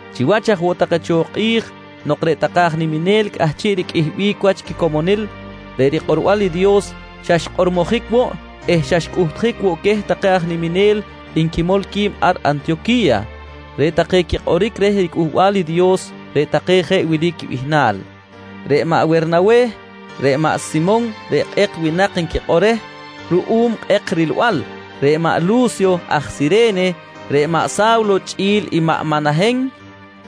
Chiwach aj woꞌ take cho kꞌi̱j nok reꞌ take aj niminel cꞌahchiꞌ riqꞌuihbic wach quicomonil, reꞌ rikꞌorbal i Dios xa xkꞌormojic woꞌ eh xa xcꞌuhtjic woꞌ queh take aj niminel nquimol qui̱b ar Antiyoqui̱ya. Reꞌ take quikꞌoric reh riCꞌuhbal i Dios, reꞌ take jeꞌ wili quibihnal: Reꞌ maꞌ Wernaweh, reꞌ maꞌ Simon reꞌ Kꞌek Winak nquikꞌor reh ruꞌum kꞌek rilbal, reꞌ maꞌ Lu̱syo aj Sire̱ne, reꞌ maꞌ Sa̱wlo chꞌi̱l i maꞌ Manahen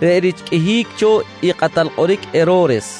reꞌ rich qꞌuihic cho i kꞌatal kꞌoric Hero̱res.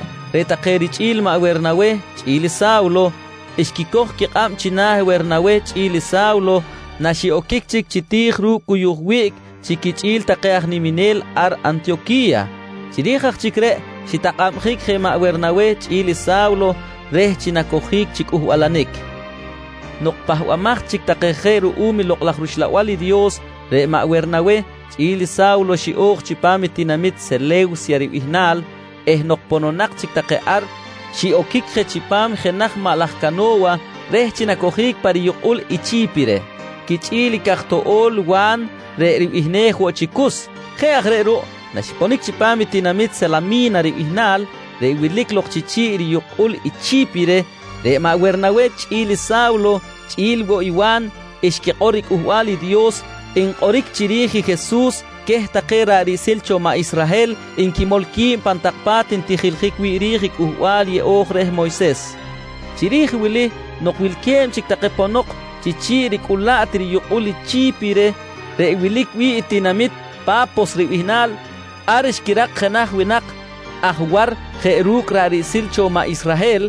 Chi jeꞌ reꞌ, reꞌ take richꞌi̱l maꞌ Wernaweh chꞌi̱l i Sa̱wlo, xquicoj quikꞌab china̱ Wernaweh chꞌi̱l i Sa̱wlo naxiꞌoquic chic chi ti̱j ru̱cꞌ cuyuj wiꞌc chi quichꞌi̱l take aj niminel ar Antiyoqui̱ya. Chiri̱j aj chic reꞌ xitakꞌabjic je maꞌ Wernaweh chꞌi̱l i Sa̱wlo reh chi nacojic chi cꞌuhbalanic. Nok pahbamaj chic take je ruꞌum i Lokꞌ laj rUxlabal i Dios, reꞌ maꞌ Wernaweh chꞌi̱l i Sa̱wlo xiꞌo̱j chipam i tinamit Sele̱wsya ribihnal eh nok pononak chic take ar, xiꞌoquic je chipam jenaj maꞌ laj cano̱wa reh chi nacojic pa riyukꞌul i Chi̱pire quichꞌi̱l i caj toꞌo̱l Wa̱n reꞌ ribihnej woꞌ chi Cus. Jeꞌ aj reꞌ ruꞌ naxiponic chipam i tinamit Salami̱na ribihnal reꞌ wilic lok chi chi̱ꞌ riyukꞌul i Chi̱pire, reꞌ maꞌ Wernaweh chꞌi̱l i Sa̱wlo chꞌi̱l woꞌ i Wa̱n xquikꞌor riCꞌuhbal i Dios nkꞌoric chiri̱j i Jesus queh take ra̱ꞌ riꞌsil cho maꞌ Israhel nquimol qui̱b pan tak pa̱t ntijiljic wi̱ꞌ ri̱j i Cꞌuhbal Yeꞌo̱j reh Moyses. Chiri̱j wili nok wilque̱b chic take ponok chi chi̱ꞌ ricꞌulaꞌt riyukꞌul i Chi̱pire reꞌ wilic wi̱ꞌ i tinamit Pa̱pos ribihnal, ar xquirak jenaj winak aj war jeꞌ ru̱cꞌ ra̱ꞌ riꞌsil cho maꞌ Israhel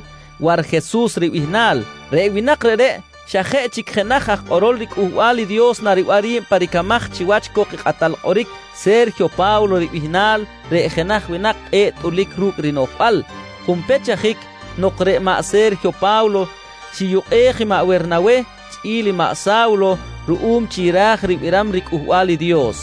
Warjesus ribihnal. Reꞌ winak reꞌreꞌ xa jeꞌ chic jenaj aj kꞌorol riCꞌuhbal i Dios nariban ri̱b pa ricamaj chiwach cok i kꞌatal kꞌoric Se̱rjiyo Pa̱wlo ribihnal reꞌ jenaj winak kꞌe̱ꞌ tꞌulic ru̱cꞌ rinoꞌjbal. Junpech ajic nok reꞌ maꞌ Se̱rjiyo Pa̱wlo xiyukꞌej i maꞌ Wernaweh chꞌi̱l maꞌ Sa̱wlo ruꞌum chi ra̱j ribiram riCꞌuhbal i Dios,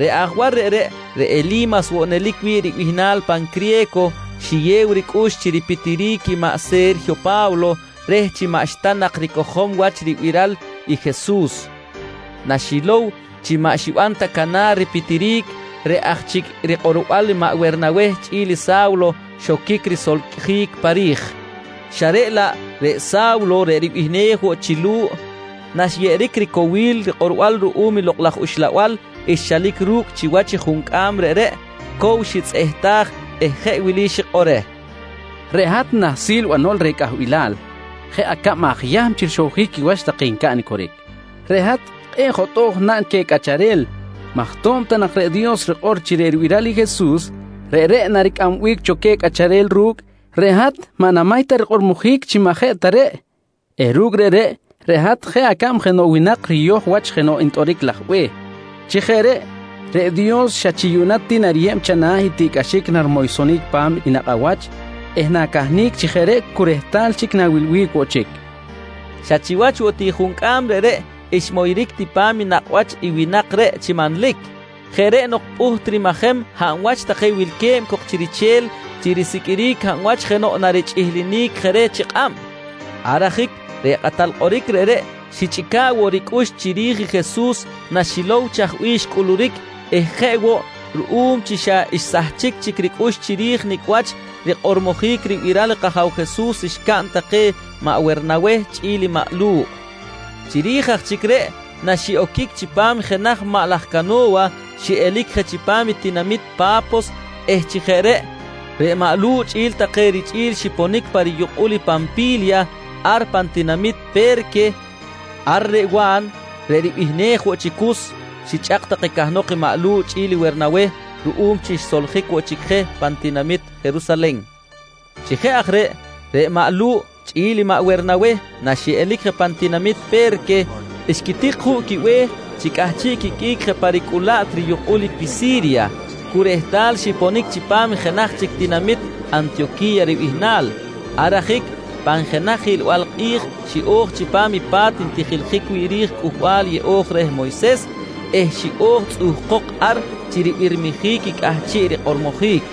reꞌ aj war reꞌreꞌ, reꞌ Eli̱mas woꞌ nelic wi̱ꞌ ribihnal pan criye̱co, xiyew ricꞌux chi ripitiric i maꞌ Se̱rjiyo Pa̱wlo reh chi maꞌxta nak ricojom wach ribiral i Jesus. Naxilow chi maꞌ xiban ta canar ripitiric, reꞌ aj chic rikꞌorbal maꞌ Wernaweh chꞌi̱l i Sa̱wlo xoquic risolcꞌjic pa ri̱j, xa reꞌ laꞌ reꞌ i Sa̱wlo reꞌ ribihnej woꞌ chi Lu̱ꞌ, naxyeꞌeric ricowil rikꞌorbal ruꞌum Lokꞌ laj Uxlabal xchalic ru̱cꞌ chiwach i juncꞌam reꞌreꞌ, cow xitzꞌehtaj eh je wili xikꞌor reh: «Reꞌ hat nahsil banol reh cꞌahbilal, jeꞌ acab aj Yahm chi rixowjic quiwach take ncaꞌn i coric. Reꞌ hat kꞌe̱ꞌ jotꞌo̱j naꞌn queh cꞌacharel maj to̱b ta nak reꞌ Dios rikꞌor chi reꞌ ribiral i Jesus, reꞌreꞌ naricꞌambic cho queh cꞌacharel ru̱cꞌ, reꞌ hat maꞌ namay ta rikꞌormojic chi maꞌ jeꞌ ta reꞌ eh ru̱cꞌ reꞌreꞌ, reꞌ hat jeꞌ acab jenoꞌ winak riyoj wach jenoꞌ ntꞌoric laj be̱h. Chi jeꞌ reꞌ, reꞌ Dios xa chi yuꞌna ti nariyeb chana̱ i tiꞌcꞌaxic narimoysonic pa̱m i nakꞌ awach eh na̱cahnic chi jeꞌ reꞌ cu rehtal chic na̱wilbic woꞌ chic, nqui maꞌ Lu̱ꞌ reh. Xa chiwach woꞌ ti juncꞌam reꞌreꞌ xmoyric ti pa̱m nakꞌ wach i winak reꞌ chi manlic. Jeꞌ reꞌ nok pꞌuht rimajem hab wach take wilque̱b cok chi riche̱l chi risiqꞌuiric hab wach jenoꞌ narichꞌihlinic je reh chi kꞌab. Ar ajic reꞌ kꞌatal kꞌoric reꞌreꞌ xichꞌica̱ꞌ woꞌ ricꞌux chiri̱j i Jesus naxilow chaj bih xcꞌuluric eh jeꞌ woꞌ ruꞌum chi xa xsahchic chic ricꞌux chiri̱j nicꞌ wach rikꞌormojic ribiral kAja̱w Jesus xcaꞌn take maꞌ Wernaweh chꞌi̱l maꞌ Lu̱ꞌ. Chiri̱j aj chic reꞌ naxiꞌoquic chipam jenaj maꞌ laj cano̱wa, xiꞌelic je chipam tinamit Pa̱pos eh chi jeꞌ reꞌ, reꞌ maꞌ Lu̱ꞌ chꞌi̱l take richꞌi̱l xiponic pa riyukꞌul i Panpi̱lya ar pan tinamit Pe̱rque. Ar reꞌ Wa̱n reꞌ ribihnej woꞌ chi Cus, xichꞌak take cahnok i maꞌ Lu̱ꞌ chꞌi̱l Wernaweh ruꞌum chi xsoljic woꞌ chic je pan tinamit Jerusalen. Chi jeꞌ aj reꞌ, reꞌ maꞌ Lu̱ꞌ chꞌi̱l maꞌ Wernaweh naxiꞌelic je pan tinamit Pe̱rque, xquitik juꞌ quibe̱h chi cꞌahchiꞌ quiqꞌuic je pa ricꞌulaꞌt riyukꞌul i Pisi̱rya cu rehtal xiponic chipam jenaj chic tinamit Antiyoqui̱ya ribihnal. Ar ajic pan jenaj hiꞌlbal kꞌi̱j xiꞌo̱j chipam i pa̱t ntijiljic wi̱ꞌ ri̱j Cꞌuhbal Yeꞌo̱j reh Moyses eh xiꞌo̱j tzꞌuhkok ar chi ribirmijic i cꞌahchiꞌ rikꞌormojic.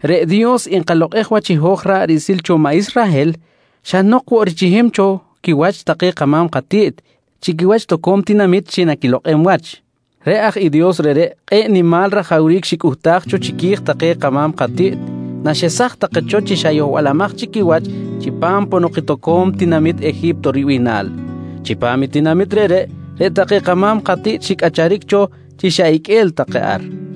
Reꞌ Dios nkalokꞌej wach i hoj ra̱ꞌ riꞌsil cho maꞌ Israhel xa nok woꞌ richihim cho quiwach take kama̱m katiꞌt chi quiwach toco̱m tinamit chi naquilokꞌem wach. Reꞌ aj i Dios reꞌreꞌ kꞌe̱ꞌ nimal rajawric xicꞌuhtaj cho chiqui̱j take kama̱m katiꞌt naxesaj take cho chi xa yohbalamaj chic quiwach chipam ponok i toco̱m tinamit Eji̱pto ribihnal. Chipam i tinamit reꞌreꞌ, reꞌ take kama̱m katiꞌt xicꞌacharic cho chi xa iqꞌue̱l take ar.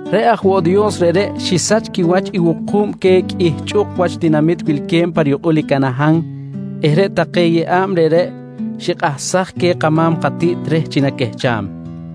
«Reꞌ aj woꞌ Dios reꞌreꞌ xisach quiwach i wuku̱b queh qꞌuih chꞌuk wach tinamit wilque̱b pa riyukꞌul i Canahan eh reꞌ take yeꞌa̱b reꞌreꞌ xikꞌahsaj queh take kama̱m katiꞌt reh chi naquehcham.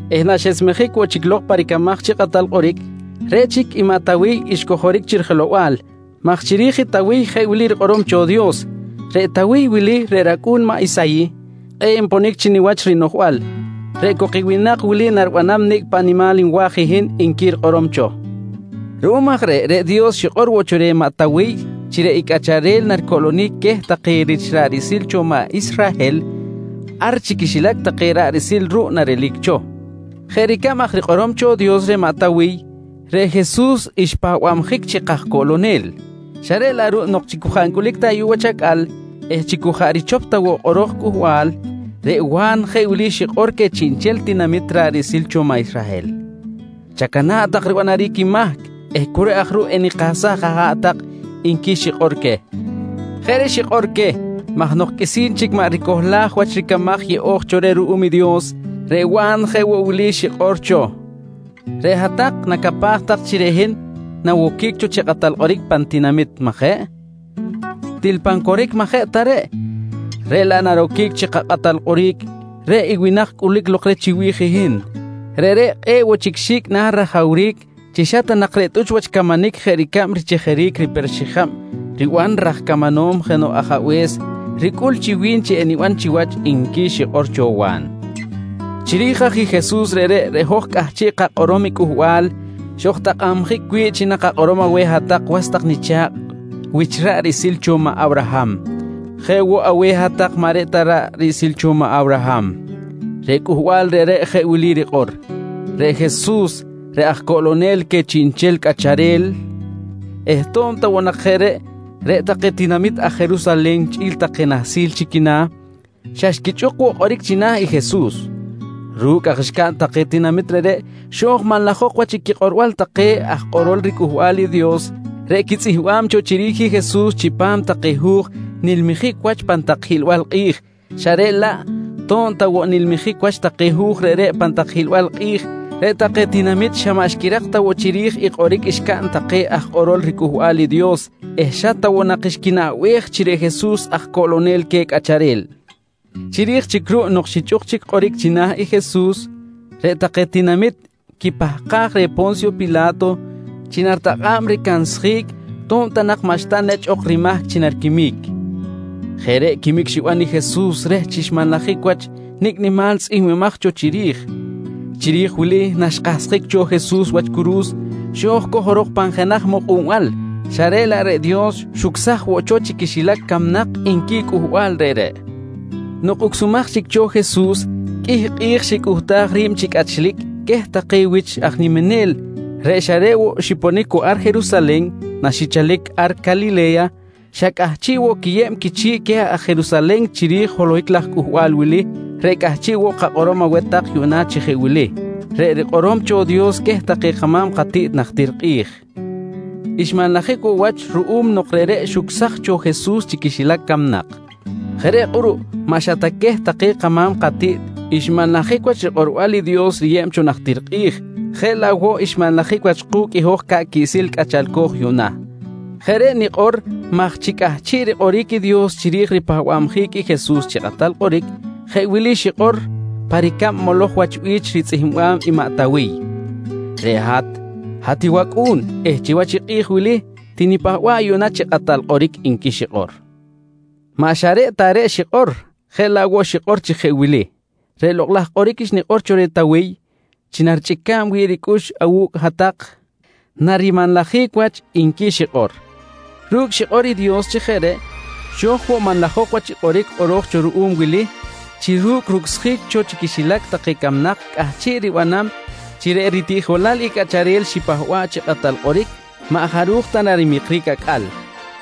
eh naxesmejic woꞌ chic lok pa ricamaj chi kꞌatal kꞌoric, reꞌ chic i maꞌ Tawiy xcojoric chi rijelow-bal, maj chiri̱j i Tawiy jeꞌ wili rikꞌorom cho Dios: ‹Reꞌ Tawiy wili reꞌ racꞌu̱n maꞌ Isayih kꞌe̱ꞌ nponic chi niwach rinoꞌjbal. Reꞌ cok i winak wili naribanam nicꞌ paꞌ nimal nwa̱j i hin, nqui rikꞌorom cho. «Ruꞌum aj reꞌ, reꞌ Dios xikꞌor woꞌ cho reh maꞌ Tawiy chi reꞌ i cꞌacharel reꞌ naricoꞌlonic queh take rich ra̱ꞌ riꞌsil cho maꞌ Israhel, ar chi quixilac take ra̱ꞌ riꞌsil ruꞌ narelic cho. «Jeꞌ ricab aj rikꞌorom cho Dios reh maꞌ Tawiy, reꞌ Jesus xpahbabjic chi kajcoꞌlonel. Xa reꞌ laꞌ ruꞌ nok chi cu jaꞌ ncꞌulic ta ayuꞌ wach acꞌal eh chi cu jaꞌ richop ta woꞌ kꞌoro̱j cꞌuhbal, reꞌ Wa̱n jeꞌ wili xikꞌor queh chiꞌnchel tinamit ra̱ꞌ riꞌsil cho maꞌ Israhel: ‹Chacana̱ꞌ tak ribanaric i mahc eh cu reꞌ aj ruꞌ enikahsaj aha̱ꞌ tak, nqui xikꞌor queh. «Jeꞌ reꞌ xikꞌor queh, maj nok qꞌuisi̱n chic maꞌ ricohlaj wach ricamaj yeꞌo̱j cho reh ruꞌum i Dios, reꞌ Wa̱n jeꞌ woꞌ wili xikꞌor cho: ‹Reꞌ hat-tak nacapaj tak chi reꞌ hin nawoquic cho chi kꞌatal kꞌoric pan tinamit, majeꞌ? Til pan coric maꞌ jeꞌ ta reꞌ. Reꞌ laꞌ naroquic chi kakꞌatal kꞌoric reꞌ i winak cꞌulic lok reh chiwi̱j hin. Reꞌreꞌ kꞌe̱ꞌ woꞌ chic xi̱cꞌ na̱ rajawric chi xa ta nak reꞌ tꞌuch wach camanic jeꞌ ricab richejeric riper xijab riban raj camanom jenoꞌ ajabe̱s, ricꞌul chi wi̱n chi eniban chiwach, nqui xikꞌor cho Wa̱n. «Chiri̱j aj i Jesus reꞌreꞌ, reꞌ hoj cꞌahchiꞌ kakꞌorom i cꞌuhbal xojtakꞌabjic wi̱ꞌ chi nakakꞌorom aweh hat-tak was tak nicha̱kꞌ wich ra̱ꞌ riꞌsil cho maꞌ Awraham jeꞌ woꞌ aweh hat-tak maꞌ reꞌ ta ra̱ꞌ riꞌsil cho maꞌ Awraham. Reꞌ cꞌuhbal reꞌreꞌ jeꞌ wili rikꞌor: ‹Reꞌ Jesus, reꞌ aj coꞌlonel queh chiꞌnchel cꞌacharel eh to̱b ta woꞌ nak jeꞌ reꞌ, reꞌ take tinamit aj Jerusalen chꞌi̱l take nahsil chi quina̱, xa xquichꞌuk woꞌ kꞌoric china̱ i Jesus. Ru̱cꞌ aj xcaꞌn take tinamit reꞌreꞌ, xo̱j manlajok wach i quikꞌorbal take aj kꞌorol riCꞌuhbal i Dios reꞌ quitzꞌihmbam cho chiri̱j i Jesus chipam take hu̱j nilmijic wach pan tak hiꞌlbal kꞌi̱j, xa reꞌ laꞌ to̱b ta woꞌ nilmijic wach take hu̱j reꞌreꞌ pan tak hiꞌlbal kꞌi̱j, reꞌ take tinamit xa maꞌ xquirak ta woꞌ chiri̱j i kꞌoric xcaꞌn take aj kꞌorol riCꞌuhbal i Dios eh xa ta woꞌ nak xquinaꞌbej chi reꞌ Jesus aj coꞌlonel queh cꞌacharel. Chiri̱j chic ruꞌ nok xichꞌuk chic kꞌoric china̱ i Jesus, reꞌ take tinamit quipahkaj reh Po̱nsyo Pila̱to chi naritakꞌa̱b ricansjic to̱b ta nak maꞌxta nechꞌ ok rimahc chi nariquimic. Jeꞌ reꞌ quimic xiban i Jesus reh chi xmanlajic wach nicꞌ nimal tzꞌihmbimaj cho chiri̱j. Chiri̱j wili naxkahsjic cho Jesus wach curu̱s, xo̱j cojorok pan jenaj mukꞌunbal, xa reꞌ laꞌ reꞌ Dios xucsaj woꞌ cho chi quixilac camnak, nqui i cꞌuhbal reꞌreꞌ. «Nok ucsumaj chic cho Jesus, qꞌuih kꞌi̱j xicꞌuhtaj ri̱b chi cꞌachlic queh take wich aj niminel reꞌ xa reꞌ woꞌ xiponic cu ar Jerusalen naxichalic ar Calile̱ya, xa cꞌahchiꞌ woꞌ quiyeb quichi̱ꞌ queh aj Jerusalen chiri̱j i holohic laj cꞌuhbal wili reꞌ cꞌahchiꞌ woꞌ kakꞌorom aweh tak yuꞌna chi jeꞌ wili: Reꞌ rikꞌorom cho Dios queh take kama̱m katiꞌt najtir kꞌi̱j, xmanlajic woꞌ wach ruꞌum nok reꞌreꞌ xucsaj cho Jesus chi quixilac camnak. Jeꞌ reꞌ kꞌuruꞌ, maꞌ xa ta queh take kama̱m katiꞌt xmanlajic wach rikꞌorbal i Dios riyeb cho najtir kꞌi̱j, jeꞌ laꞌ woꞌ xmanlajic wach ku̱cꞌ i hoj ca̱ꞌ quiꞌsil cꞌachalco̱j yuꞌna. Jeꞌ reꞌ nikꞌor maj chi cꞌahchiꞌ rikꞌoric i Dios chiri̱j ripahba̱bjic i Jesus chi kꞌatal kꞌoric, jeꞌ wili xikꞌor pa ricab moloj wach bi̱ch ritzꞌihmbam maꞌ Tawiy: “Reꞌ hat, hat wAcꞌu̱n eh chiwach i kꞌi̱j wili tinipahba̱ꞌ yuꞌna chi Kꞌatal Kꞌoric, nqui xikꞌor. «Maꞌ xa reꞌ ta reꞌ xikꞌor, jeꞌ laꞌ woꞌ xikꞌor chi jeꞌ wili: “Reꞌ lokꞌ laj kꞌoric xnikꞌor cho reh Tawiy chi narichꞌica̱b wi̱ꞌ ricꞌux awu̱cꞌ hat-tak narimanlajic wach, nqui xikꞌor. «Ru̱cꞌ xikꞌor i Dios chi jeꞌ reꞌ, xo̱j woꞌ manlajok wach i kꞌoric kꞌoro̱j cho ruꞌum wili chi ru̱cꞌ rucsjic cho chi quixilac take camnak cꞌahchiꞌ ribanam chi reꞌ ritiꞌjolal i cꞌacharel xipahba̱ꞌ chi Kꞌatal Kꞌoric maꞌ jaruj ta narimikric acꞌal.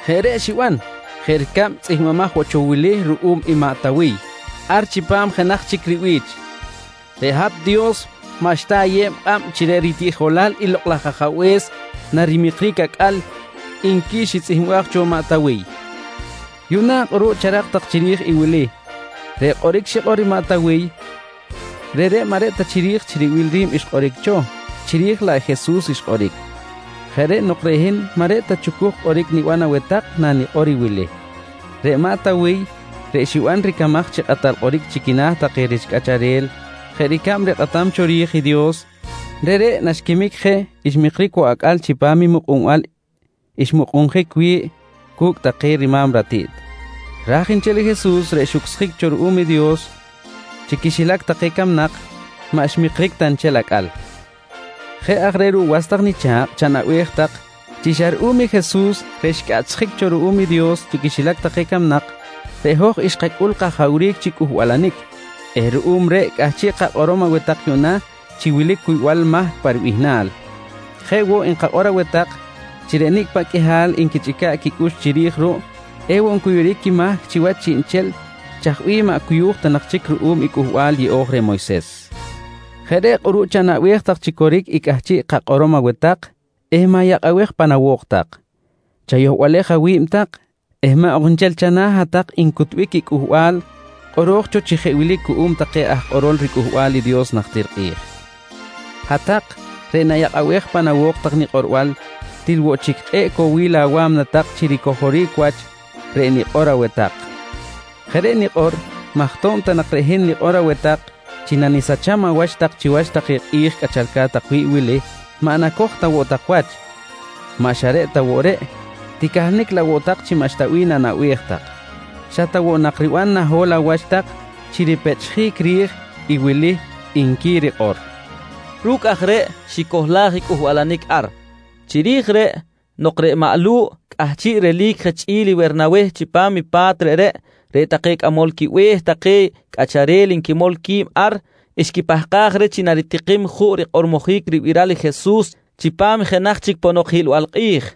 Jeꞌ reꞌ xiban, jeꞌ ricab tzꞌihmbimaj woꞌ cho wili ruꞌum i maꞌ Tawiy ar chipam jenaj chic ribi̱ch: “Reꞌ hat Dios maꞌxta ayeb kꞌab chi reꞌ ritiꞌjolal i Lokꞌ laj Ajabe̱s narimikric acꞌal, nqui xitzꞌihmbaj cho maꞌ Tawiy. «Yuꞌna kꞌuruꞌ charak tak chiri̱j i wili: Reꞌ kꞌoric xikꞌor maꞌ Tawiy reꞌreꞌ maꞌ reꞌ ta chiri̱j chi ribil ri̱b xkꞌoric cho, chiri̱j laꞌ Jesus xkꞌoric. Jeꞌ reꞌ nok reꞌ hin maꞌ reꞌ ta chucuj kꞌoric niban aweh tak nanikꞌor i wili: Reꞌ maꞌ Tawiy reꞌ xiban ricamaj chi kꞌatal kꞌoric chi quina̱ take rich cꞌacharel jeꞌ ricab rikꞌatam cho ri̱j i Dios, reꞌreꞌ naxquimic je xmikric woꞌ acꞌal chipam i mukꞌunbal xmukꞌunjic wi̱ꞌ cu̱cꞌ take rima̱m ratiꞌt raj nchel Jesus reꞌ xucsjic cho ruꞌum i Dios chi quixilac take camnak, maꞌ xmikric ta nchel acꞌal. «Jeꞌ aj reꞌ ruꞌ was tak nicha̱kꞌ chanaꞌbej tak chi xa ruꞌum i Jesus reꞌ xcꞌaꞌchsjic cho ruꞌum i Dios chi quixilac camnak, reꞌ hoj xkacꞌul kajawric chi cꞌuhbalanic eh ruꞌum reꞌ cꞌahchiꞌ kakꞌorom aweh tak yuꞌna chi wilic cuybal mahc pa ribihnal. Jeꞌ woꞌ nkakꞌor aweh tak chi reꞌ nicꞌ paꞌ qꞌuihal take nquichꞌica̱ꞌ quicꞌux chiri̱j ruꞌ ewoꞌ ncuyuric quimahc chiwach chiꞌnchel chaj bih maꞌ cuyu̱j ta nak chic ruꞌum i Cꞌuhbal Yeꞌo̱j reh Moyses. Jeꞌ reꞌ kꞌuruꞌ chanaꞌbej tak chi coric i cꞌahchiꞌ kakꞌorom aweh tak eh ma̱yakꞌabej pan awo̱k tak. Chayohbalej awi̱b tak eh maꞌ ok nchel chana̱ hat-tak ncutbic i cꞌuhbal kꞌoro̱j cho chi jeꞌ wili cuꞌum take aj kꞌorol riCꞌuhbal i Dios najtir kꞌi̱j: “Hat-tak reꞌ nayakꞌabej pan awo̱k tak nikꞌorbal, til woꞌ chic kꞌe̱ꞌ cowil awa̱mna tak chi ricojoric wach reꞌ nikꞌor aweh tak. Jeꞌ reꞌ nikꞌor maj to̱b ta nak reꞌ hin nikꞌor aweh tak chi nanisacham awach tak chiwach take kꞌi̱j cꞌachalca̱t tak wi̱ꞌ wili, maꞌ nacoj ta woꞌ tak wach. Maꞌ xa reꞌ ta woꞌ reꞌ, ticahnic laꞌ woꞌ tak chi maꞌxta bih nanaꞌbej tak. Xa ta woꞌ nak riban naho̱l awach tak chi ripechꞌjic ri̱j i wili, nqui rikꞌor, nqui maꞌ Lu̱ꞌ. Ru̱cꞌ aj reꞌ xicohlaj i cꞌuhbalanic ar. Chiri̱j reꞌ, nok reꞌ maꞌ Lu̱ꞌ cꞌahchiꞌ relic je chꞌi̱l i Wernaweh chipam i pa̱t reꞌreꞌ, reꞌ take cꞌamol quibe̱h take cꞌacharel nquimol qui̱b ar, xquipahkaj reh chi naritikim juꞌ rikꞌormojic ribiral i Jesus chipam i jenaj chic ponok hiꞌlbal kꞌi̱j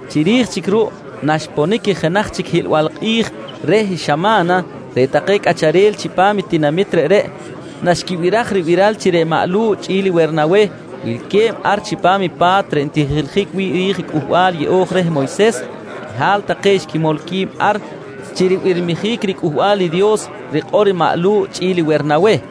Chiri̱j chic ruꞌ naxponic i jenaj chic hiꞌlbal kꞌi̱j reh xama̱na, reꞌ take cꞌacharel chipam i tinamit reꞌreꞌ naxquibiraj ribiral chi reꞌ maꞌ Lu̱ꞌ chꞌi̱l Wernaweh wilque̱b ar chipam i pa̱t reꞌ ntijiljic wi̱ꞌ ri̱j i Cꞌuhbal Yeꞌo̱j reh Moyses, qꞌuihal take xquimol qui̱b ar chi ribirmijic riCꞌuhbal i Dios rikꞌor i maꞌ Lu̱ꞌ chꞌi̱l Wernaweh.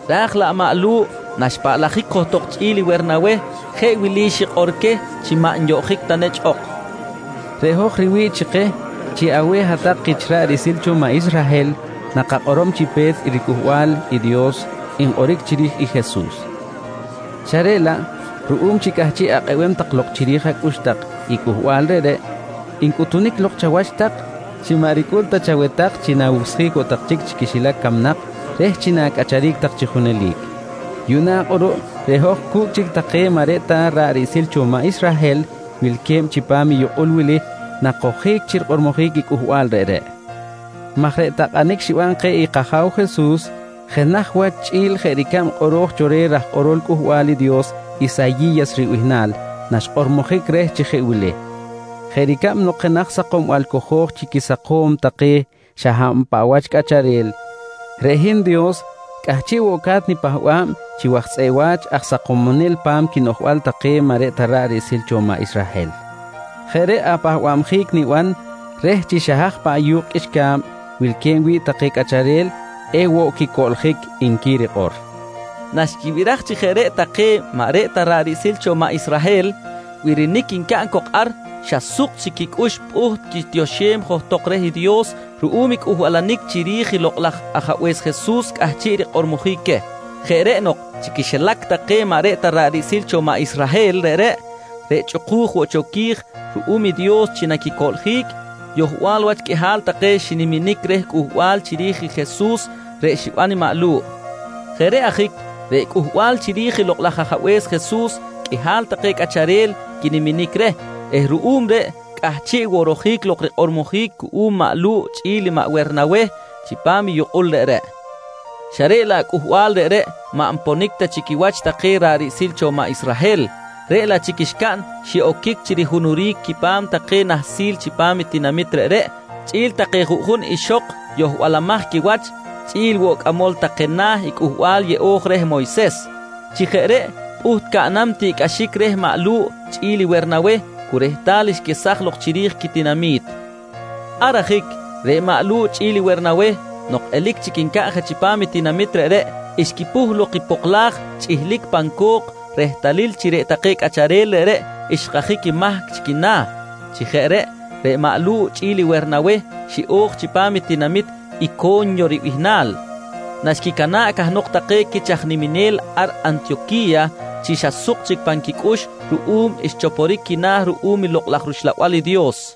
Raj laꞌ maꞌ Lu̱ꞌ naxpahꞌic johtok chꞌi̱l i Wernaweh jeꞌ wili xikꞌor queh chi maꞌ nyoꞌjic ta nechꞌ ok: «Reꞌ hoj riwi̱ꞌ chi keh, chi aweh hat-tak kich ra̱ꞌ riꞌsil cho maꞌ Israhel nakakꞌorom chi pe̱t i riCꞌuhbal i Dios nkꞌoric chiri̱j i Jesus. Xa reꞌ laꞌ ruꞌum chi cꞌahchiꞌ akꞌebem tak lok chiri̱j acꞌux tak i cꞌuhbal reꞌreꞌ, ncꞌutunic lok chawach tak chi maꞌ ricꞌul ta chaweh tak chi na̱wucsjic woꞌ tak chic chi quixilac camnak reh chi na̱cꞌacharic tak chi junelic. Yuꞌna kꞌuruꞌ reꞌ hoj cu̱cꞌ chic take maꞌ reꞌ ta ra̱ꞌ riꞌsil cho maꞌ Israhel wilque̱b chipam i yukꞌul wili nakojic chi rikꞌormojic i cꞌuhbal reꞌreꞌ maj reꞌ takꞌanic xiban keh i kAja̱w Jesus jenaj wach chꞌi̱l jeꞌ ricab kꞌoro̱j cho reh raj kꞌorol Cꞌuhbal i Dios Isayi̱yas ribihnal naxkꞌormojic reh chi jeꞌ wili: “Jeꞌ ricab nok jenaj sakombal cojo̱j chi quisakom take xa hab paꞌ wach cꞌacharel, reꞌ hin Dios cꞌahchiꞌ woꞌ ca̱t nipahba̱b chi waj tzꞌeꞌ wa̱ch aj sakomonel pa̱m quinoꞌjbal take maꞌ reꞌ ta ra̱ꞌ riꞌsil cho maꞌ Israhel. Jeꞌ reꞌ apahbabjic niban reh chi xa haj paꞌ yu̱kꞌ qꞌuixca̱b wilque̱b wi̱ꞌ take cꞌacharel ewoꞌ quicoꞌljic, nqui rikꞌor, nqui maꞌ Lu̱ꞌ queh. Naxquibiraj chi jeꞌ reꞌ take maꞌ reꞌ ta ra̱ꞌ riꞌsil cho maꞌ Israhel birinic ncaꞌn cok ar, xa suk chic quicꞌux pꞌuht quitioxem johtok reh Dios ruꞌum i Cꞌuhbal chiri̱j i Lokꞌ laj Ajabe̱s Jesus cꞌahchiꞌ rikꞌormojic queh. Jeꞌ reꞌ nok, chi quixilac take maꞌ reꞌ ta ra̱ꞌ riꞌsil cho maꞌ Israhel reꞌreꞌ, reꞌ chꞌuku̱j woꞌ cho qui̱j ruꞌum i Dios chi naquicoꞌljic, yohbal wach qꞌuihal take xiniminic reh cꞌuhbal chiri̱j Jesus reꞌ xiban i maꞌ Lu̱ꞌ. Jeꞌ reꞌ ajic reꞌ Cꞌuhbal chiri̱j i Lokꞌ laj Ajabe̱s Jesus qꞌuihal take cꞌacharel quiniminic reh eh ruꞌum reꞌ cꞌahchiꞌ woꞌ rojic lok rikꞌormojic cuꞌum maꞌ Lu̱ꞌ chꞌi̱l Wernaweh chipam i yukꞌul reꞌreꞌ. Xa reꞌ laꞌ cꞌuhbal reꞌreꞌ maꞌ nponic ta chi quiwach take ra̱ꞌ riꞌsil cho maꞌ Israhel, reꞌ laꞌ chic xcaꞌn xiꞌoquic chi rihunuric quipa̱m take nahsil chipam i tinamit reꞌreꞌ chꞌi̱l take juꞌjun ixok yohbalamaj quiwach chꞌi̱l woꞌ cꞌamol take na̱ i Cꞌuhbal Yeꞌo̱j reh Moyses. Chi jeꞌ reꞌ pꞌuht caꞌnam tiꞌcꞌaxic reh maꞌ Lu̱ꞌ chꞌi̱l Wernaweh cu rehtal xquesaj lok chiri̱j quitinami̱t. Ar ajic reꞌ maꞌ Lu̱ꞌ chꞌi̱l Wernaweh nok elic chic ncaꞌn je chipam i tinamit reꞌreꞌ, xquipuh lok i poklaj chꞌihlic pan co̱k rehtalil chi reꞌ take cꞌacharel reꞌreꞌ xkajic mahc chi quina̱. Chi jeꞌ reꞌ, reꞌ maꞌ Lu̱ꞌ chꞌi̱l i Wernaweh xiꞌo̱j chipam i tinamit Ico̱nyo ribihnal naxquicana̱ꞌ cahnok take quich aj niminel ar Antiyoqui̱ya chi xa suk chic pan quicꞌux ruꞌum xchoporic quina̱ ruꞌum i Lokꞌ laj rUxlabal i Dios.